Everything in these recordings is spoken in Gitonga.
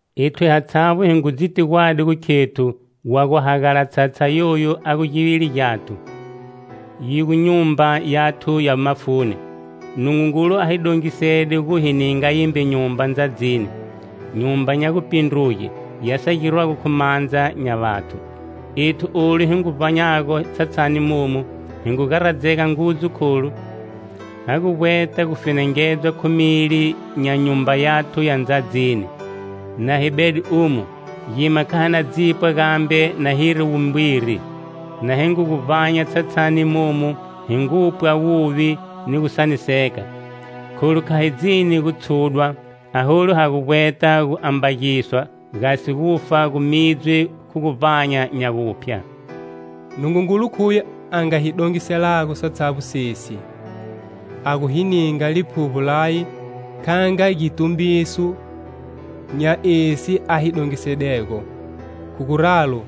Ethu hatshavbo hi ngu dziti gwadi gu khethu wa gu hagala tshatsha yoyu a gu givili gyathu, yi gu nyumba yathu ya mafuni, Nungungulu a hi dongisede gu hi ninga yimbe nyumba ndzadzini, nyumba nya gupindruge ya sa girwago khu mandza nya vathu. Ethu olu hi ngu gu vbanyago tshatshani momu hi ngu garadzega ngudzu kholu ha gu vbweta gu fenengedzwa khu mili nya nyumba yathu ya ndzadzini. Na hi bede umo, gima kha hi na dzipwa gambe na hiri wumbwiri. Na hi ngu gu vbanya tshatshani momu hi ngupwa wuvi ni gusaniseka, kholu kha hi dzini gu tshudwa, aholu ha gu vbweta gu ambagiswa gasi gufa gu midzwe khu guvbanya nya guphya. Nungungulu khuye a nga hi dongiselago satshavbo sesi; a gu hi ninga Liphuvbo laye kha nga gitumbiso nya esi a hi dongisedego. Khu guralo,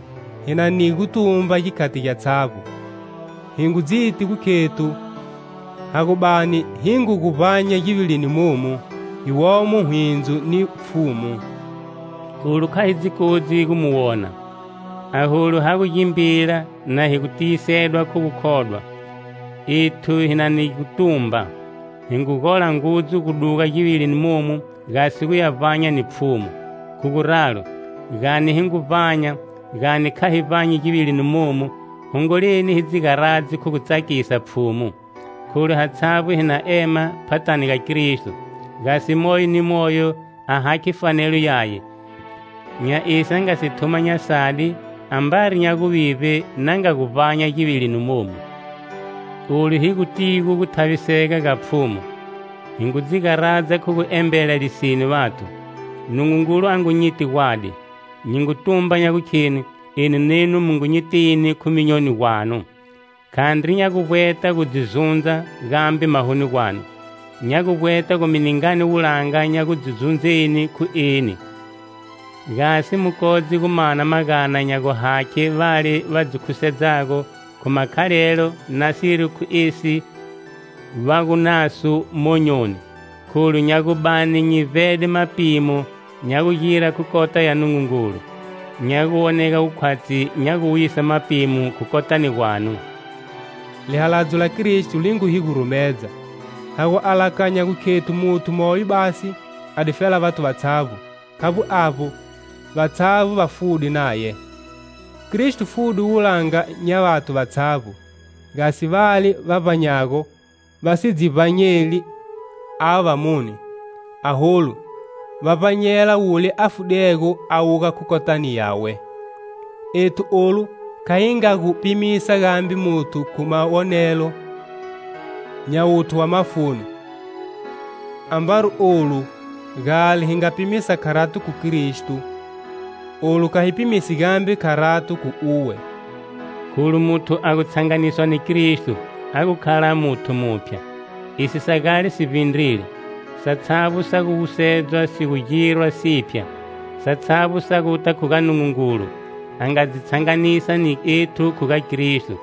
hi na ni gutumba gikhati gyatshavbo. Hi ngu dziti gu khethu ha gu bani hi ngu gu vbanya givilini momu, hi womo hwindzo ni Pfhumu. Olu kha hi dzi kodzi gu mu wona, aholu ha gu gimbila na hi gu tiyisedwa khu gukhodwa. Ethu hi na ni gutumba, hi ngu gola ngudzu gu duga givilini momu gasi gu ya vbanya ni Pfhumu. Khu guralo, gani hi ngu vbanya, gani kha hi vbanyi givilini momu, hongoleni hi dzi garadze khu gu tsakisa Pfhumu. Kholu hatshavbo hi na ema phathani ga Kristo, gasi moyo ni moyo a hakhe fanelo yaye, nya esi a nga si thuma nya sadi ambari nya guvivbe na nga gu vbanya givilini momu. Olu hi gutigo gu thavisega ga Pfhumu, hi ngu dzi garadza khu gu embela lisine vathu. Nungungulu a ngu nyiti gwadi, nyi ngu tumba nya gukheni enu nenu mu ngu nyitini khu myonyoni gwanu. Khandri nya gu vbweta gu dzi zundza gambe mahoni gwanu. Nya gu vbweta gu mi ningani wulanga nya gu dzi zundzeni khu eni, gasi mu kodze gu mana magana nya guhakhe vale va dzi khusedzago khu makhalelo nasiri khu esi va gu naso monyoni. Kholu nya gu bani nyi vbede mapimo nya gugira khu kota ya Nungungulu; nya gu wonega gu khwatshi nya gu wuyisa mapimo khu kotani gwanu. Lihaladzo la Kristo li ngu hi gurumedza, ha gu alakanya gu khethu muthu moyo basi a difela vathu vatshavbo, khavbo avbo vatshavbo va fude naye. Kristo fude wulanga nya vathu vatshavbo, gasi vale va vbanyago va si dzi vbanyeli avo vamune, aholu va vbanyela wule a fudego a wuga khu kotani yawe. Ethu olu kha hi nga gu pimisa gambe muthu khu mawonelo nya wuthu wa mafuni. Ambari olu gale hi nga pimisa kharato khu Kristo, olu kha hi pimisi gambe kharato khu uwe. Kholu muthu a gu tshanganiswa ni Kristo a gu khala muthu muphya. Esi sa gale si vbindrile, satshavbo sa gu wusedzwa si gu girwa siphya. Satshavbo sa guta khu ga Nungungulu, a nga dzi tshanganisa ni ethu khu ga Kristo,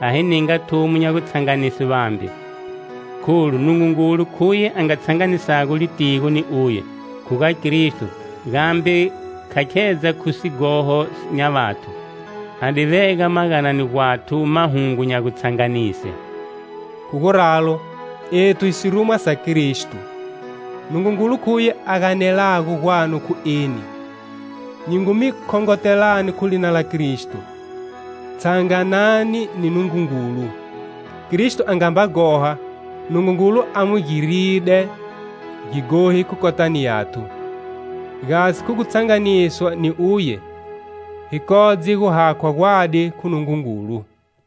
a hi ninga thumo nya gutshanganise vambe. Kholu Nungungulu khuye a nga tshanganisago litigo ni Uye, khu ga Kristo, gambe kha khedza khu sighoho nya vathu, a di vega maganani gwathu mahungu nya gutshanganise. Khu guralo, ethu hi sirumwa sa Kristo, Nungungulu khuye a ganelago gwanu khu eni. Nyi ngu mi khongotelani khu lina la Kristo: Tshanganani ni Nungungulu. Kristo a nga mba ghoha, Nungungulu a mu giride gighohi khu kotani yathu, gasi, khu gutshanganiswa ni uye, hi kodze gu hakhwa gwadi khu Nungungulu.